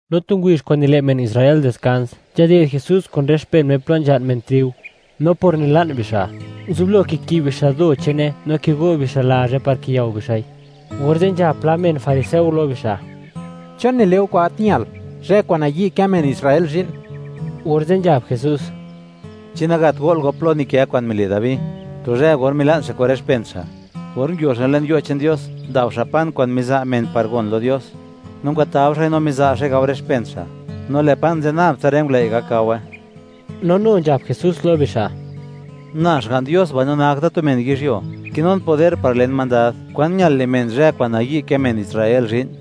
No tu ngubizh kwa'n nile' men Israel diskans, nzhaded Jesús kun rë men che'n Me plo nzha'n men triu. No por nila'n bixa', nguzublo kikib bixa' do che'ne, no kigo' bixa' lazhe par kiyao bixa'i, orze' nzhab pla men fariseo lo bixa': ―¿Chon nile' go kwa'n gat ñal, zhë kwa'n nayi' kë men Israel zhi'n? Orze' nzhab Jesús: ―¿Chi nagat go'l go plo nikë kwa'n mile' Dabi tu zhë or mila'n xa' kun rë xpen xa'?, or nguio xa' le'n yo' che'n Dios par ndao xa' pan kwa'n miza' men par gon lo Dios, no ngwatao xa'i no miza' xa'i gao rë xpen xa', no lë' pan ze' nab tsa rë ngulëi' gak gawe. No nu nzhab Jesús lo bixa': ―Na Xga'n Dios mbaino nak da tu men yizhyuo, kinun poder par len mandad, kwan ñal le' men zhë kwa'n nayi' kë men Israel zhi'n.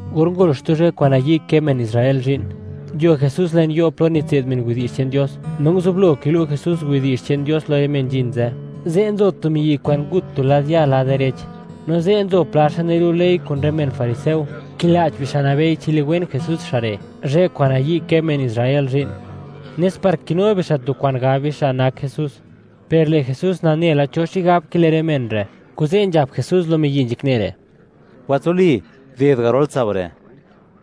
Or ngol xtu zhë kwa'n nayi' kë men Israel zhi'n, nguio Jesús le'n yo' plo nitse'd men widi'zh che'n Dios, no nguzublo kilu' Jesús widi'zh che'n Dios lo rë men nzhin ze'. Ze' nzo tu miyi' kwa'n ngut tu lad ya' lad direch. No ze', nzo pla xa' nilu' ley kun rë men fariseo, kila'ch bixa', nabei chi liwen Jesús xa' re', zhë kwa'n nayi' kë men Israel zhi'n, nes par kinu bixa' tu kwa'n gab bixa', nak Jesús. Per lë' Jesús nane la cho xigab kile' rë men re', kuze' nzhab Jesús lo miyi' nzhakne re': ―Watsuli, guded garol tsao' re'.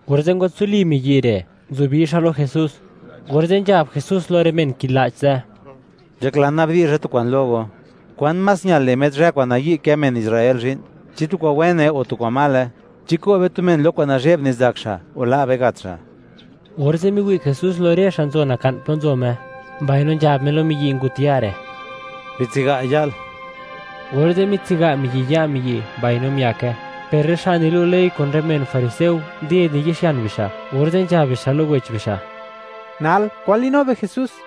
Orze' ngwatsuli miyi' re', nguzubi xa' lo Jesús. Orze' nzhab Jesús lo rë men kila'ch ze': ―Nzhaklan nabdi'zha tu kwa'n lo go: ¿Kwan más ñal le' met zhë kwa'n nayi' kë men Israel zhi'n? ¿Chi tu kwa'n wene o tu kwa'n male? ¿Chi ko' be tu men lo tu kwa'n nazhe'b nizak xa', o la' be gat xa'? Orze' miwi' Jesús lo rë xa' nzo naka'n plo nzo Me, mbaino nzhab Me lo miyi' ngut ya' re': ―Bitsiga' ya'l. Orze', mitsiga' miyi' ya' miyi', mbaino miake. Per rë xa' nilu' ley kun rë men fariseo nded niyi'xian bixa', orze' nzhab bixa' lo wech bixa': “Nal, ¿kwan li'nu be Jesús?”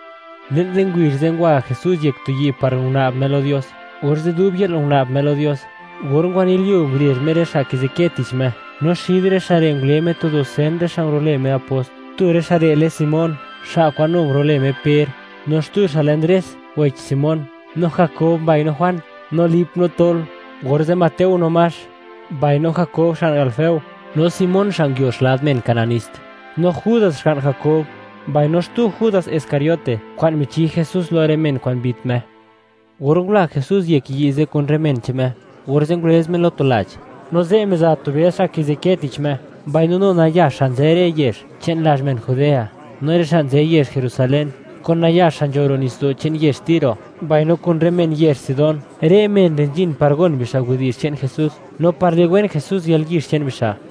Le'n rë ngubizh ze', ngwa Jesús yek tu yi' par guna'b Me lo Dios, orze' dub yë'l guna'b Me lo Dios. Or ngwanilyuo, ngurezh Me rë xa' kizikë tich Me, no xid rë xa' re' ngule Me tu dusen rë xa' ngulo'lë Me apost. Tu rë xa' re' lë Simón, xa' kwa'n nu ngurulë Me Per; no xtu xa' lë Ndres, wech Simón; no Jakob mbaino Juan; no Lip, no Tol; orze' Mateo no Max; mbaino Jakob xga'n Alfeo; no Simón xa' nguio xlad men Kananist; no Judas, xga'n Jakob; mbaino xtu Judas Iscariote, kwa'n michi Jesús lo rë men kwa'n mbit Me. Or ngula Jesús yek yi' ze' kun rë men che'n Me, orze' ngulëz Me lo tu lach, no ze' miza tu bëd xa' kizikë tich Me, mbaino nu nayax xa' nzë rë yezh che'n lazh men Judea no rë xa' nzë yezh Jerusalén, kun nayax xa' nzho ro' nitsdo' che'n yezh Tiro mbaino kun rë men yezh Sidón. Rë men re' nzhin par gon bixa' widi'zh che'n Jesús no par liwen Jesús yalyizh che'n bixa';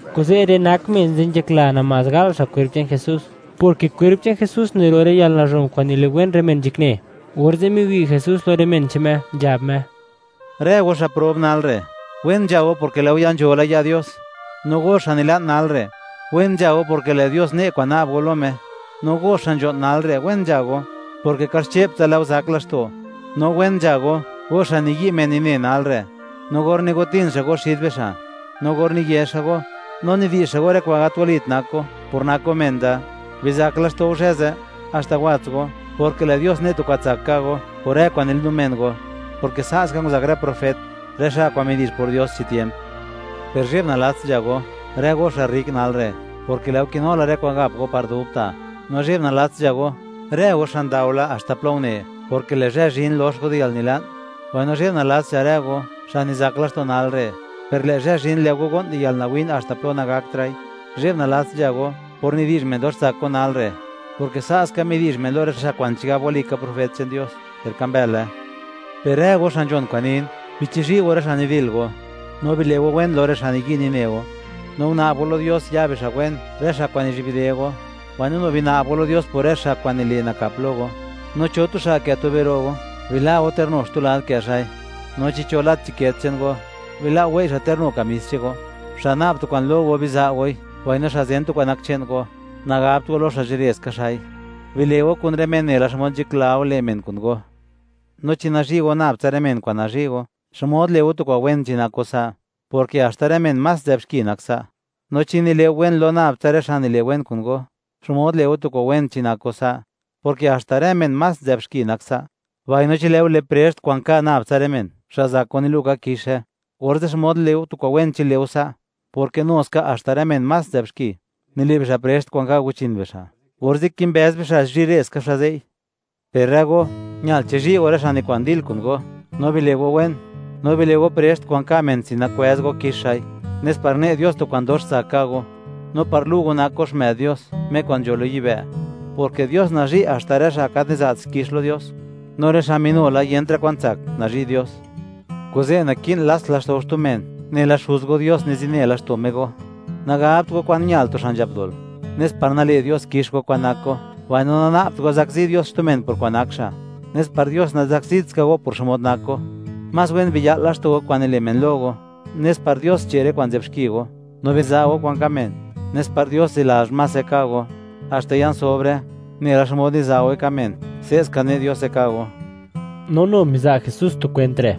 Kuze' rë nak men ze' nzhakla namás gal xa' kwerp che'n Jesús, porke kwerp che'n Jesús niro' rë yalnazhon kwa'n niliwen rë men nzhakne. Orze' miwi' Jesús lo rë men che'n Me, nzhab Me: ―Rë go, xa' prob nal re', wen nzha go; porke lë' go ya nzho la ya' Dios. ’No go, xa' nila'n nal re', wen nzha go, porke lë' Dios ne' kwa'n na'b go lo Me. ’No go, xa' nzho'n nal re', wen nzha go, porke kaxche'ptsa lë' go zak laxto'. ’No wen nzha go, go xa' niyi' men nine nal re', no or nigotin xa' go xid bixa', no or niye xa' go, no nidi'zh xa' go, rë kwa'n gat walit nak go, por nak go men da. Bizak laxto' go zhë ze', haxta wats go, porke lë' Dios ne' tu kwa'n tsak ka' go por rë kwa'n nilinu men go; porke sa' ska nguzak rë profet, rë xa' kwa'n midi'zh por Dios chi tiemp. ’Per zhe'b nalats nzha go, rë go xa' rrik nal re'; porke lë' go kinu la rë kwa'n gap go par dubta'. ’No zhe'b nalats nzha go, rë go xa' ndao la haxta plo une, porke lë' zhë zhin, lox go di yalnila'n. ’Mbaino zhe'b nalats nzha rë go, xa' nizak laxto' nal re', per lë' zhë zhin, lë' go go'n di yalnawin haxta plo nagakra'i. ’Zhe'b nalats nzha go, por nidi'zh men dox tsak go nal re'; porke sa' ska midi'zh men lo rë xa' kwa'n chigab walika profet che'n Dios, per ka mbële. ’Per rë go xa' nzhon kwa'n nin, bichizhi' go rë xa' nidil go, no bile' go wen lo rë xa' niyi' nine go; no guna'b go lo Dios, ya bixa' wen, rë xa' kwa'n nizhi'bde go, mbaino nu bina'b go lo Dios por rë xa' kwa'n nile' nakap lo go. No cho tu xa' kë' tube ta' ro' go, bila' go ter nu xtu lad kë' xa'i, no chi cho lat chiket che'n go, bila' go wei' xa' ter nu kamis che'n go. Xa' na'b tu kwa'n lo go, biza' goi, mbaino xa' zen tu kwa'n nak che'n go, nagabt go lo xa' zhire ska xa'i. Bile' go kun rë men nela xmod nzhakla go le' men kun go. ’No chi nazhi' go nab tsa rë men kwa'n nazhi' go, ¿xmod le' go tu kwa'n wen chi nak go sa'?, porke haxta rë men más nzë'b xki, nak sa'. No chi nile' go wen lo nab tsa rë xa' nile' wen kun go, ¿xmod le' go tu kwa'n wen chi nak go sa'?, porke haxta rë men más nzë'b xki, nak sa'. Mbaino chi lë' go le' prext kwa'n ka' nab tsa rë men xa' zak go nilu' ka kixe, orze', ¿xmod le' go tu kwa'n wen chi le' go sa'?, porke nu ska haxta rë men más nzë'b xki, nile' bixa' prext kwa'n ka' guchin bixa', orze' kimbëz bixa' zhire ska xa' ze'i. Per rë go, ñal chizhi' go rë xa' nikwa'n dil kun go, no bile' go wen; no bile' go prext kwa'n ka' men sin nakwëz go kix xa'i, nes par ne' Dios tu kwa'n dox tsak ka' go, no par lu' go nak go xmë'd Dios, Me kwa'n nzho lo yibë', porke Dios nazhi' haxta rë xa' gat niza't xkix lo Dios, no rë xa' minu la yentra' kwan tsak, nazhi' Dios. Kuze', naki'n lats laxto' go xtu men nela Xuz go Dios nizine laxto' Me go. ’Nagabt go kwan ñal tu xa' nzhap dol, nes par nale' Dios kix go kwa'n nak go; mbaino nana'bt go zakzi Dios xtu men por kwa'n nak xa', nes par Dios nazakzit ska go por xmod nak go. Más wen biya'l laxto' go kwa'n nile' men lo go, nes par Dios che' rë kwa'n nzë'b xki go. No biza' go kwa'n ka' men, nes par Dios zilazh mase ka' go, haxta ya'n sobre; nela xmod niza' goi ka' men, se' ska ne' Diose ka' go. No nu miza' Jesús tu kwent re':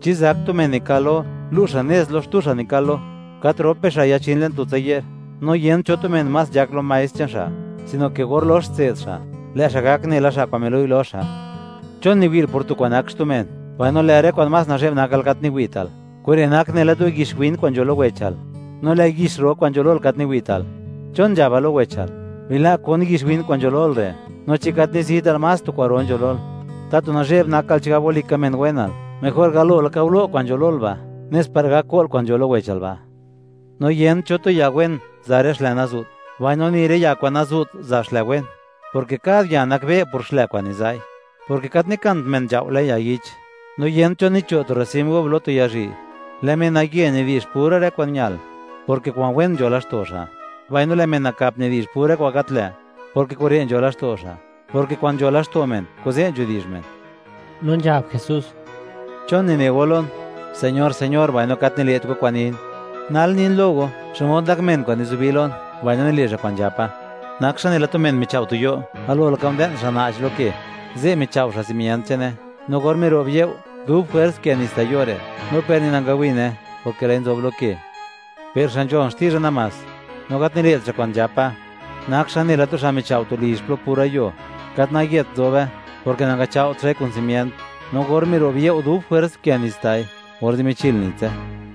―¿Chi zak tu men nikal lo, lu' xa' nez lo xtu xa' nikal lo? ¿Gat rop bixa' yachin le'n tu zo? No yent cho tu men más nzhak lo maestr che'n xa', sino ke or lox tse'd xa', lë' xa' gak nela xa' kwa'n milu'i lo xa'. ’¿Chon niwi'l por tu kwa'n nak xtu men, mbaino lë' rë kwa'n más nazhe'b nakal gat niwi'tal? Kure' nak nela tu yix win kwa'n nzho lo wechal, no lë' yix ro kwa'n nzho lol gat niwi'tal. ¿Chon nzhabal lo wechal: “Bila' kon yix win kwa'n nzho lol re'”, no chi gat nizital, más tu kwa'ro nzho lol? ¡Tatu nazhe'b nakal, chigab walika men wenal! Mejor galo laka ngulo' kwa'n nzho lol ba', nes par gak ko'l kwa'n nzho lo wechal ba'. ’No yent cho tu ya wen za' rë xlë nazu't, mbaino ni rë ya kwa'n nazu't, za' xlë wen, porke kad ya nakbe' por xlë kwa'n niza'i, porke gat nikant men nzhao' le'n ya yich, no yent cho cho' tu rosim gub lo tu ya zhii'. Lë' menaye nidi'zh pura rë kwa'n ñal, porke kwa'n wen nzho laxto' xa'; mbaino lë' men nakap nidi'zh pura kwa'n gat lë', porke kure' nzho laxto' xa', porke kwa'n nzho laxto' men, kuze' nidi'zh men. No nzhab Jesús: ―¿Chon nine go lon: “Señor, Señor”, mbaino gat nile't go kwa'n nin? Nal nin lo go, xmod nak men kwa'n nizubi lon, mbaino nile' xa' kwa'n nzhapa. Nak xa' nela tu men michao' tu yo'. Galo laka nde'n xa' na'ch lo ke, ze' michao' xa' simient che'ne. No or miro'b you', dub jwers nkë nits ta' yo' re', no per ni nangawine, porke lë'i nzob lo ke. Per xa' nzhon xtizha namás, no gat nile't xa' kwa'n nzhapa, nak xa' nela tu xa' michao' tu lizh plo pura yuo, gat nayet nzobe, porke nangachao't xa'i kun simient. No or miro'b you', dub jwers nkë nits ta'i, orze' michil nitse.